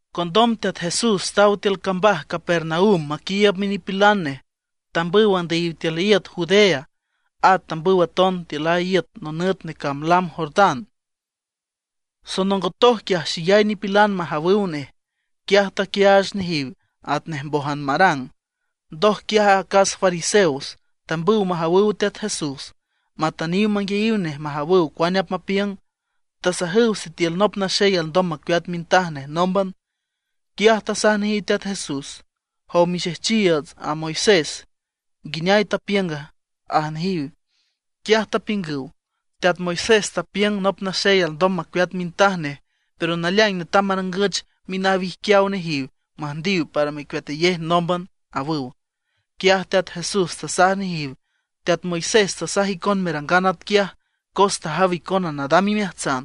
Condom Teat Jesús taw tiül cambaj Capernaum maquiiüb minipilan nej, tambüw andüyiw tiül iüt Judea. At tambüw aton tiül a iüt nonüt necamb lam Jordán. Sonongotoj quiaj xeyay nipilan majawüw nej. Quiaj taquiaach nejiw atnej mbójan marang. Ndoj quiaj acas fariseos tambüw majawüw Teat Jesús matüntüniw manguiayiw nej majawüw cuane apmapiüng. Tasajüw sitiül nop naxey alndom macueat mintaj nej nómban. Quiaj tasaj nejiw Teat Jesús: ―Jow mixejchiiüts a Moisés, ¿nguineay tapiünga? ―aj nejiw. Quiaj tapiüngüw: ―Teat Moisés tapiüng nop naxey alndom macueat mintaj nej, pero naleaing netam marangüch minawijquiaw nejiw müjndiw para mecueatayej nómban ―awüw. Quiaj Teat Jesús tasaj nejiw: ―Teat Moisés tasaj icon merangan atquiaj cos tajaw icona nadam imeajtsan.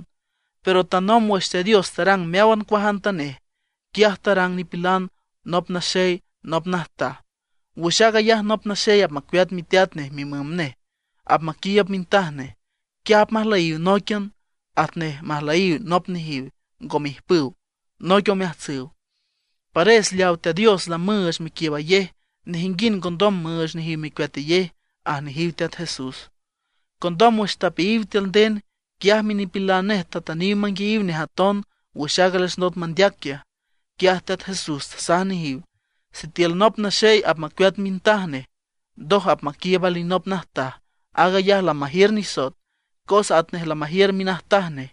Pero tanomb wüx Teat Dios tarang meáwan cuajantanej, “quiaj tarang nipilan nop naxey nop najtaj”. “Wüx aag ayaj nop naxey apmacueat miteat nej mimüm nej, apmaquiiüb mintaj nej. Quiaj apmajlüyiw nóiquian, atnej majlüyiw nop nejiw ngome ijpüw, noic omeajtsüw.” Pares leawa Teat Dios lamüüch mequiiübayej nejinguind ngondom müüch nejiw mecueatayej ―aj nejiw Teat Jesús. Condom wüx tapeayiw tiül nden, quiaj minipilan nej tatüniw manguiayiw nej aton wüx aaga les ndot mandeac quiaj. Quiaj Teat Jesús tasaj nejiw: ―Sitiül nop naxey apmacueat mintaj nej, ndoj apmaquiiüb alinop najtaj, aag ayaj lamajiür nisoet, cos atnej lamajiür minajtaj nej.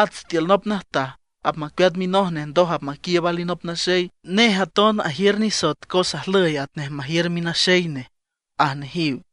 At sitiül nop najtaj apmacueat minoj nej ndoj apmaquiiüb alinop naxey, nej aton ajiür nisoet cos ajlüy atnej majiür minaxey nej ―aj nejiw.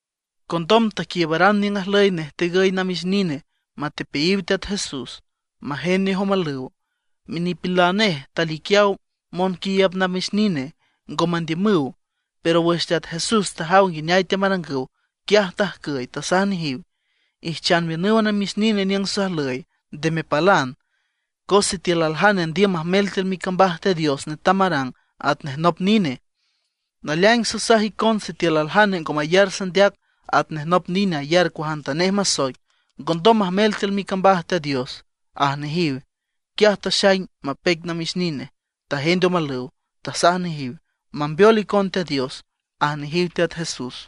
Condom taquiiübaran niüng ajlüy nej tegüy namix nine matepeayiw Teat Jesús, majend nej omalüw. Minipilan nej taliquiaw monquiiüb namix nine, ngo mandiümüw. Pero wüx Teat Jesús tajaw nguineay teamarangüw, quiaj tajcüy, tasaj nejiw: ―Ijchan miünüw a namix nine niüng sajlüy, nde mepalan. Cos sitiül aljane andiüm majmel tiül micambaj Teat Dios netam marang atnej nop nine. Naleaing sasaj icon sitiül aljane ngo mayar sandeac atnej nop nine ayar cuajantanej masoic, ngondom majmel tiül micambaj Teat Dios ―aj nejiw. Quiaj taxaing mapeic namix nine, tajend omalüw, tasaj nejiw: ―Mambeol icon Teat Dios ―aj nejiw Teat Jesús.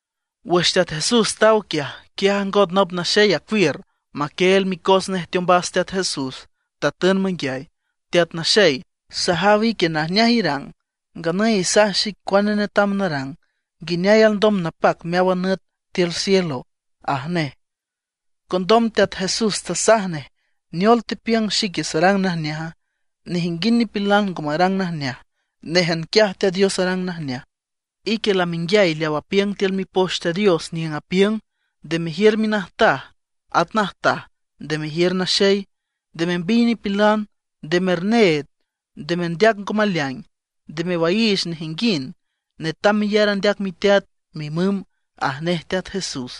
Wüx Teat Jesús taw quiaj, quiaj ajngot nop naxey acuiür, maquieel micos nej teombas Teat Jesús, tatün manguiay: ―Teat Naxey, sajaw ique najneaj irang. Nganüy isaj xic cuane netam narang, nguineay alndom napac meáwan nüt tiül cielo ―aj nej. Condom Teat Jesús tasaj nej: ―¿Neol tepiüng xique sarang najneaja? Nejinguind nipilan ngo marang najneaj, néjan quiaj Teat Dios arang najneaj. Ique lamenguiay leaw apiüng tiül Mipoch Teat Dios niüng apiüng: “Nde mejiür minajtaj, at najtaj nde mejiür naxey; nde membiy nipilan; nde merneed; nde merndeac ngo maleaing; nde mewaiich nejinguind; netam meyar andeac miteat, mimüm” ―aj nej Teat Jesús.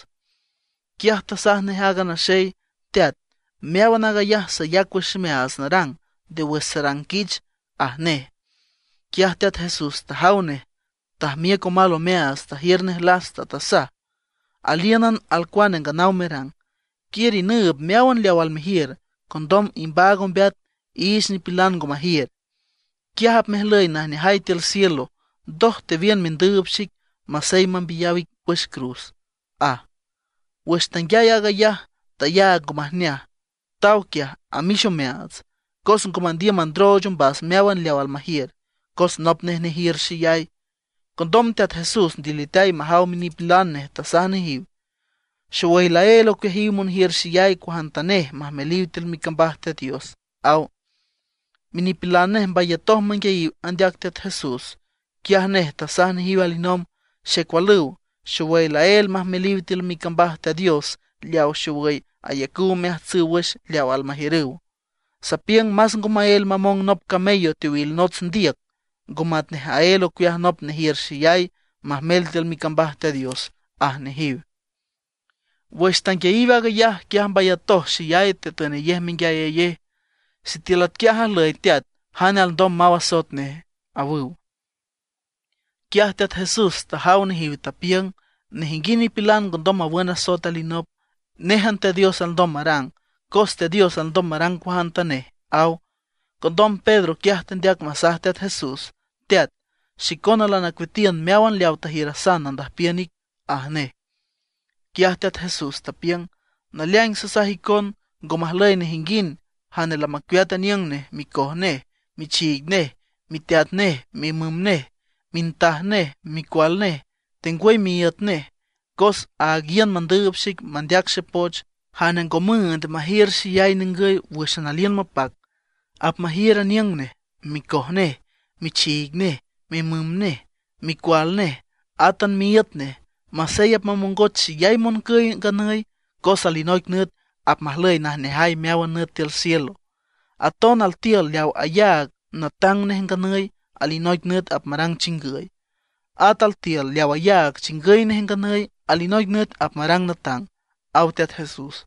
Quiaj tasaj nej aaga naxey: ―Teat, meáwan aag ayaj sayac wüx ximeaats narang nde wüx sarang quich ―aj nej. Quiaj Teat Jesús tajaw nej, tajmiüc omal omeaats, tajiür nej lasta, tasaj: ―Alíünan alcuane nganaw merang. Quiür inüüb meáwan leaw almejiür. Condom imbaag ombeat iich nipilan ngo majiür; quiaj apmejlüy najneajay tiül cielo. Ndoj tewiün mendüüb xic, masey mambiyaw ic wüx cruz ―aj. Wüx tanguiay aag ayaj tayaag ngo majneaj, taw quiaj amix omeaats; cos ngo mandiüm mandrooch ombas meáwan leaw almajiür, cos nop nej nejiür xeyay. Condom Teat Jesús ndiliteay majaw minipilan nej, tasaj nejiw: ―Xowüy laél ocueajiw monjiür xeyay cuajantanej majmeliw tiül micambaj Teat Dios ―aw. Minipilan nej mbayatoj manguiayiw andeac Teat Jesús. Quiaj nej tasaj nejiw alinomb: ―Xecualüw, xowüy laél majmeliw tiül micambaj Teat Dios leawa xowüy ayacüw omeajtsüw wüx leaw almajiürüw. Sapiüng más ngo maél mamong nop camello teowil nots ndiüc, ngo matnej aél ocueaj nop nejiür xeyay majmel tiül micambaj Teat Dios ―aj nejiw. Wüx tanguiayiw aag ayaj, quiaj mbayatoj xeyay, tetünayej menguiayayej: ―Sitiül atquiaj ajlüy teat, ¿jane alndom maw asoet nej? ―awüw. Quiaj Teat Jesús tajaw nejiw, tapiüng: ―Nejinguind nipilan ngondom mawün asoet alinop, néjan Teat Dios alndom marang. Cos Teat Dios alndom marang cuajantanej ―aw. Condom Pedro quiaj tendeac masaj Teat Jesús: ―Teat, xicona lanacueatiün meáwan leawa tajiürasan nandüjpiün ic ―aj nej. Quiaj Teat Jesús tapiüng: ―Naleaing sasaj icon, ngo majlüy nejinguind jane lamacueat aniüng nej, micoj nej, michiig nej, miteat nej, mimüm nej, mintaj nej, micual nej, tengwüy miíüt nej, cos áag iün mandüüb xic mandeac xepoch; jane ngo müünd majiür xeyay ningüy wǘxan aliün mapac, apmajiür aniüng nej, micoj nej, michiig nej, mimüm nej, micual nej, átan miíüt nej. Masey apmamongoch xeyay moncüy nganüy, cos alinoic nüt apmajlüy najneajay meáwan nüt tiül cielo. Aton altiül leaw ayaag natang nej nganüy, alinoic nüt apmarang chingüy; at altiül leaw ayaag chingüy nej nganüy, alinoic nüt apmarang natang ―aw Teat Jesús.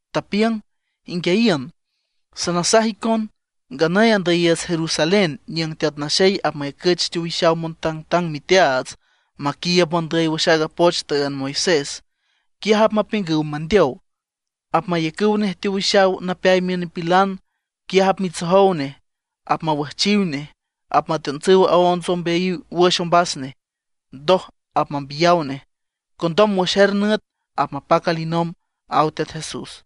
Tapiüng: ―Inguiayiün, sanasaj icon, nganüy andüyiiüts Jerusalén niüng Teat Naxey apmayacüch teowixaw montangtang miteaats maquiiüb mondüy wüx aaga poch tüünd Moisés. Quiaj apmapiüngüw mandeow, apmayacüw nej teowixaw napeay miün nipilan. Quiaj apmitsojow nej, apmawüjchiw nej, apmateontsüw onts ombeayiw wüx ombas nej, ndoj apmambiyaw nej. Condom wüx er nüt apmapac alinomb ―aw Teat Jesús.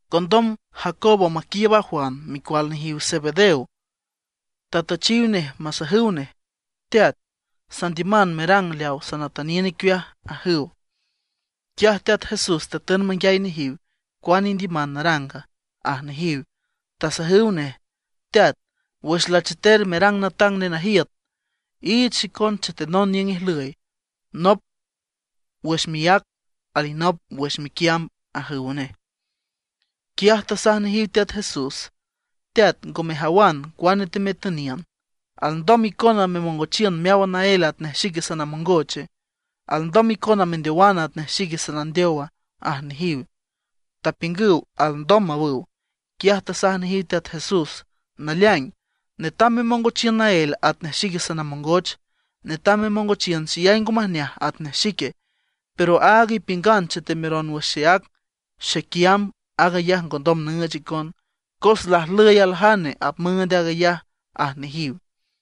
Condom Jacobo maquiiüb a Juan, micual nejiw Zebedeo, tatüchiw nej masajüw: ―Teat, sandiüman merang leawa sanatüniün icueaj ―ajüw. Quiaj Teat Jesús tatün manguiay nejiw: ―¿Cuane indiüman naranga? ―aj nejiw. Tasajüw nej: ―Teat, wüx lacheter merang natang nenajiüt, iich xicon chetenon niüng ijlüy, nop wüx miác, alinop wüx miquiamb ―ajüw nej. Quiaj tasaj nejiw Teat Jesús: ―Teat, ngo mejawan cuane teametüniün. ¿Alndom icona memongochiün meáwan naél atnej xique sanamongoche? ¿Alndom icona mendeowan atnej xique sanandeowa? ―aj nejiw. Tapiüngüw: ―Alndom ―awüw. Quiaj tasaj nejiw Teat Jesús: ―Naleaing, netam memongochiün naél atnej xique sanamongoch, netam memongochiün xeyay ngo majneaj atnej xique. Pero aaga ipiüngan chetemeron wüx xeác xequiamb, aag ayaj ngondom nüüch icon, cos lajlüy aljane apmüünd aag ayaj ―aj nejiw.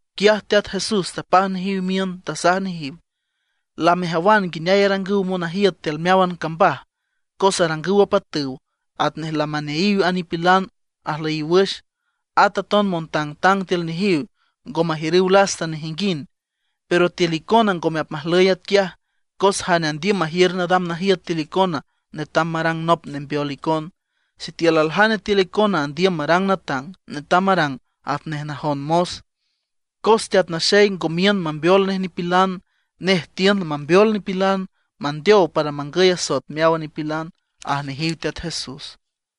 Quiaj Teat Jesús tapaj nejiw miün, tasaj nejiw: ―Lamejawan nguineay arangüw monajiüt tiül meáwan cambaj. Cos arangüw apatüw atnej lamaneayiw a nipilan ajlüyiw wüx. At aton montangtang tiül nejiw ngo majiürüw lasta nejinguind. Pero tiül icona ngome apmajlüy atquiaj. Cos jane andiüm majiür nadam najiüt tiül icona netam marang nop nembeol icon. Sitiül aljane tiül icona andiüm marang natang, netam marang atnej najon mos. Cos Teat Naxey ngo miün mambeol nej nipilan, nej tiün mambeol nipilan, mandeow para mangüy asoet meáwan nipilan ―aj nejiw Teat Jesús.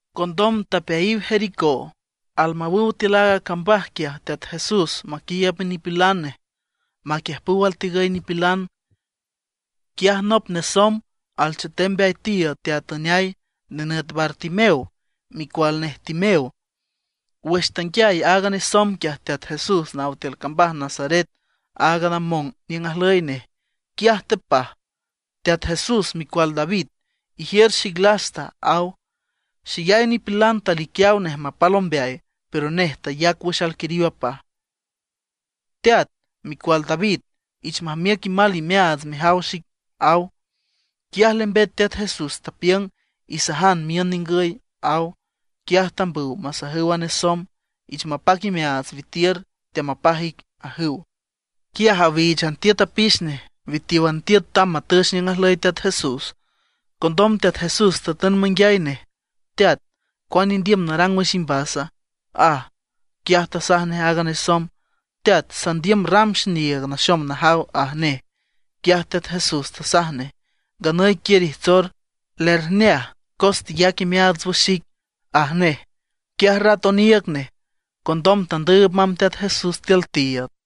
Condom tapeayiw Jericó. Almawüw tiül aaga cambaj quiaj Teat Jesús maquiiüb minipilan nej maquiüjpüw altegüy nipilan, quiaj nop nesomb alchetem mbeay tiiüd teatüneay, nenüt Bartimeo, micual nej Timeo. Wüx tanguiay aaga nesomb quiaj Teat Jesús naw tiül cambaj Nazaret, áag namong niüng ajlüy nej. Quiaj tepaj: ―¡Teat Jesús, Micual David, ijiür xic lasta! ―aw. Xeyay nipilan taliquiaw nej mapal ombeay, pero nej tayac wüx alquiriw apaj: ―¡Teat, Micual David, ich majmiüc imal imeaats mejaw xic! ―aw. Quiaj lembet Teat Jesús, tapiüng: ―Isajan miün ningüy ―aw. Quiaj tambüw masajüw a nesomb: ―Ich mapac imeaats, witiür, teamapaj ic ―ajüw. Quiaj awíichan tiüt apix nej witiówan tiüt tamb matüch niüng ajlüy Teat Jesús. Condom Teat Jesús tatün manguiay nej: ―¿Teat, cuane indiüm narang wüx imbasa? ―aj. Quiaj tasaj nej aaga nesomb: ―Teat, sandiüm ram xiniiüg naxom najaw ―aj nej. Quiaj Teat Jesús tasaj nej: ―Nganüy quiür ijtsor, lerjneaj cos teyac imeaats wüx xic ―aj nej. Quiaj rat oniiüg nej, condom tandüüb mamb Teat Jesús tiül tiiüd.